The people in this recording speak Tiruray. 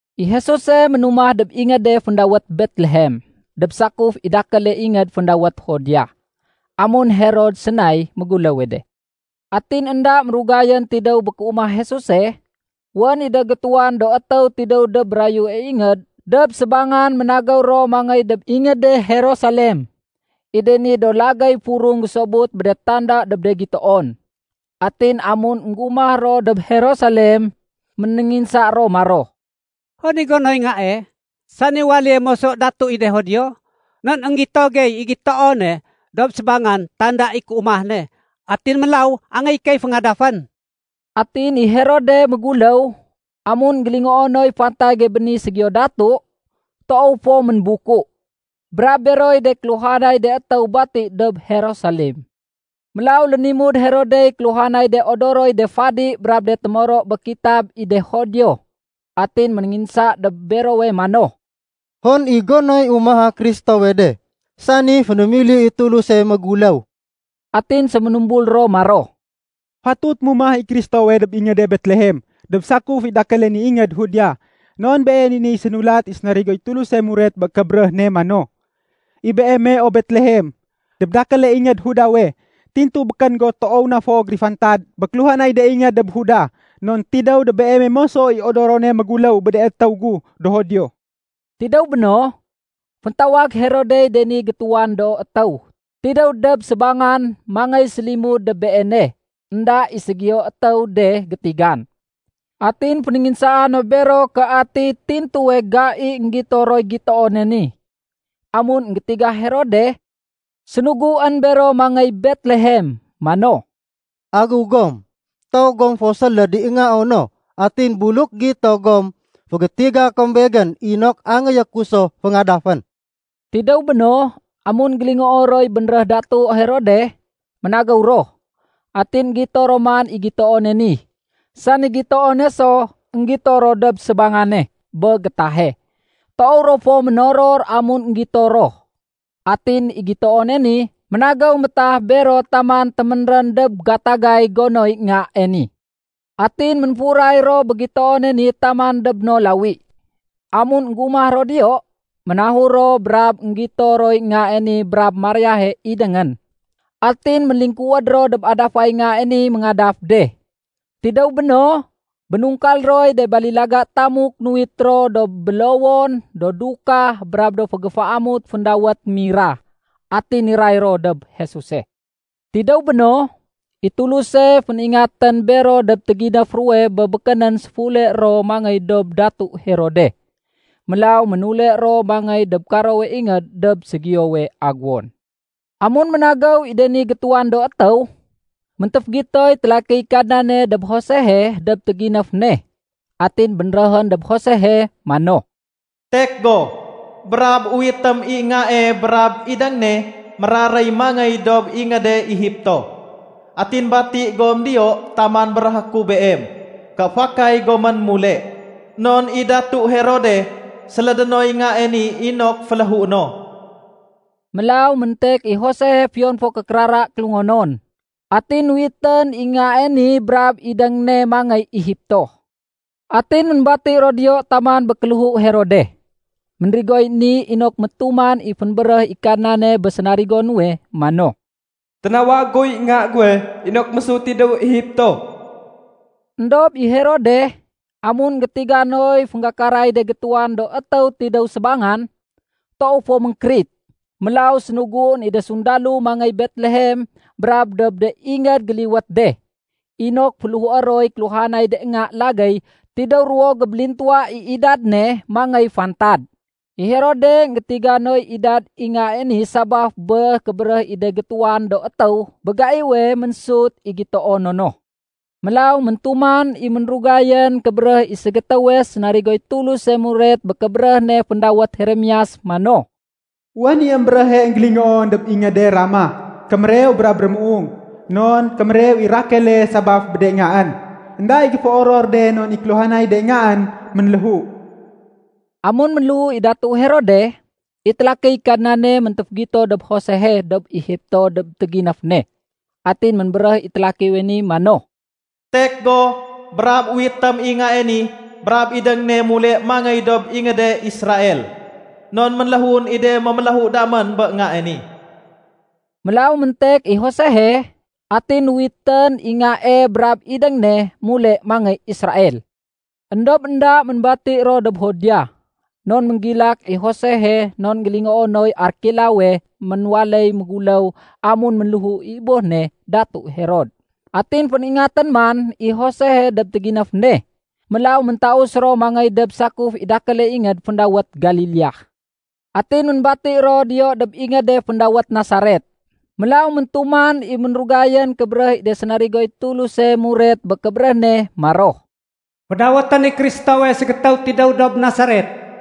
I Jesuse ménumah dob ingéde féndawét Betlehem dob sakuf i dakéle ingéd féndawét Judea, amun Herod sénay méguléwe de. Atin énda mérugayén tidéw bé kéumah Jesuse, wén i de gétuwan do étéw tidéw dob mérayue ingéd dob sébangan ménagéw ro mangéy dob ingéde Jerusalem. I de ni do lagéy furung gésobut bé de tanda dob de gitoon. Atin amun énggumah ro dob Jerusalem, ménénginsa ro maro, “Hon i gonoy Ngae, sani waléye moso Datu i de Judio? Non énggito gey i gitoone dob sébangan tanda i kéumah ne. Atin mélaw angéyé key féngadafén.” Atin i Herode méguléw, amun énggélingoo noy fantage bé ni ségiyo datu, toow fo ménbuku, brab beroy de kéluhanay de étéw bati dob Jerusalem. Mélaw lénimud Herodey kéluhanay de odoroy de fadi brab de témoro bé kitab i de Judio, atin ménénginsa dob berowe mano, “Hon i gonoy umaha Kristowe de, sani fénémili i Tuluse méguléw?” Atin séménumbul ro maro, “Fatut mumah i Kristowe dob ingéde Betlehem dob sakuf i dakéle ni ingéd Judea. Non been i niy sénulat i sénarigoy Tuluse muret bé kébéréh ne mano, ‘I beeme, o Betlehem, dob dakéle ingéd Judawe, tintu békén go toow na fo gérifantad bé kéluhanay de ingéd dob Juda. Non tidéw dob beeme moso i odorone méguléw bé de étéw gu do Judio.’” Tidéw béno, féntawag Herodey de ni gétuwan do étéw tidéw dob sébangan mangéy sélimud dob beene énda i ségiyo étéw de gétigan. Atin fénénginsaa no bero ké ati tintuwe gai énggito roy gitoone ni. Amun énggétiga Herode, sénuguén bero mangéy Betlehem mano, “Agéw gom, toow gom fo séléd i Ngao no. Atin buluk gito gom, fégétiga kom begén inok angéyé ku so féngadafén.” Tidéw béno, amun énggélingoo roy bénréh Datu Herode, ménagéw ro. Atin énggito ro man i gitoone ni, sani gitoone so énggito ro dob sébangane bé gétahe. Toow ro fo ménoror amun énggito ro. Atin i gitoone ni ménagéw métah bero taman téménrén dob gatagay gonoy Ngae ni. Atin ménfuray ro bé gitoone ni taman dob no lawi. Amun énggumah ro diyo, ménahur ro brab énggito roy Ngae ni brab Mariahe idéngén. Atin ménlingkuwéd ro dob adafay Ngae ni méngadaf de. Tidéw béno, bénungkal roy de balilaga tamuk nuwit ro do bélowon, do dukah, brab do fégéféamut féndawét mira. Atin niray ro dob Jesuse. Tidéw béno, i Tuluse féningatén bero dob téginéf ruwe bé békénén séfule ro mangéy dob Datu Herode. Mélaw ménule ro mangéy dob karowe ingéd dob ségiyowe aguwon. Amun ménagéw i de ni gétuwan do étéw, méntéfégitoy télakiy Kadnane dob Josehe dob téginéf ne. Atin bénréhén dob Josehe mano, “Tek go, brab uwitém i Ngae brab idéng ne méraréy mangéy dob ingéde Egipto. Atin bati gom diyo taman béréhé ku beem ké fakay gomén mule. Non i Datu Herode sélédé noy Ngae ni inok féléhué no.” Mélaw méntek i Josehe fiyon fo ké kérara kélungonon, atin nuwitén i Ngae ni brab idéng ne mangéy Egipto. Atin ménbati ro diyo taman bé kéléhu Herode. Ménrigoy ni inok métuman i fénbéréh i Kadnane bé sénarigo nuwe mano, “Ténawag guy Nga guwe inok mésut tidéw Egipto.” Endob i Herode, amun énggétiga noy fénggakaray de gétuwan do étéw tidéw sébangan, toow fo ménkérit. Mélaw sénuguén i de sundalo mangéy Betlehem brab dob de ingéd géliwét de, inok féléhué roy kéluhanay de nga lagéy tidéw ruwo gébélintuwa i idad ne mangéy fantad. I Herode énggétiga noy idad i Ngae ni sabaf bé kébéréh i de gétuwan do étéw bé gaiwe ménsut i gitoono no. Mélaw méntuman i ménrugayén kébéréh i ségétéwe sénarigoy Tuluse muret bé kébéréh ne féndawét Jeremias mano, “Wén i émbéréhe énggélingoon dob ingéde Rama, kémérew brab rémuung. Non kémérew i Rakele sabaf bé de ngaén. Enda i géféoror de non i kéluhanay de ngaén ménléhu.” Amun ménléhu i Datu Herode, i télakiy Kadnane méntéfégito dob Josehe dob Egipto dob téginéf ne. Atin ménbéréh i télakiwe ni mano, “Tek go brab uwitém i Ngae ni brab idéng ne mule mangéy dob ingéde Israel. Non ménléhuén i de méméléhu damén bé Ngae ni.” Mélaw méntek i Josehe atin nuwitén i Ngae brab idéng ne mule mangéy Israel. Endob énda ménbati ro dob Judea non ménggilak i Josehe non énggélingoo noy Arkelaowe ménwaléy méguléw amun ménléhu i boh ne Datu Herod. Atin féningatén man i Josehe dob téginéf ne, mélaw méntaus ro mangéy dob sakuf i dakéle ingéd féndawét Galilea. Atin ménbati ro diyo dob ingéde féndawét Nasaret. Mélaw méntuman i ménrugayén kébéréh i de sénarigoy Tuluse muret bé kébéréh ne maro, “Fédawétén i Kristowe ‘ségétéw tidéw dob Nasaret.’”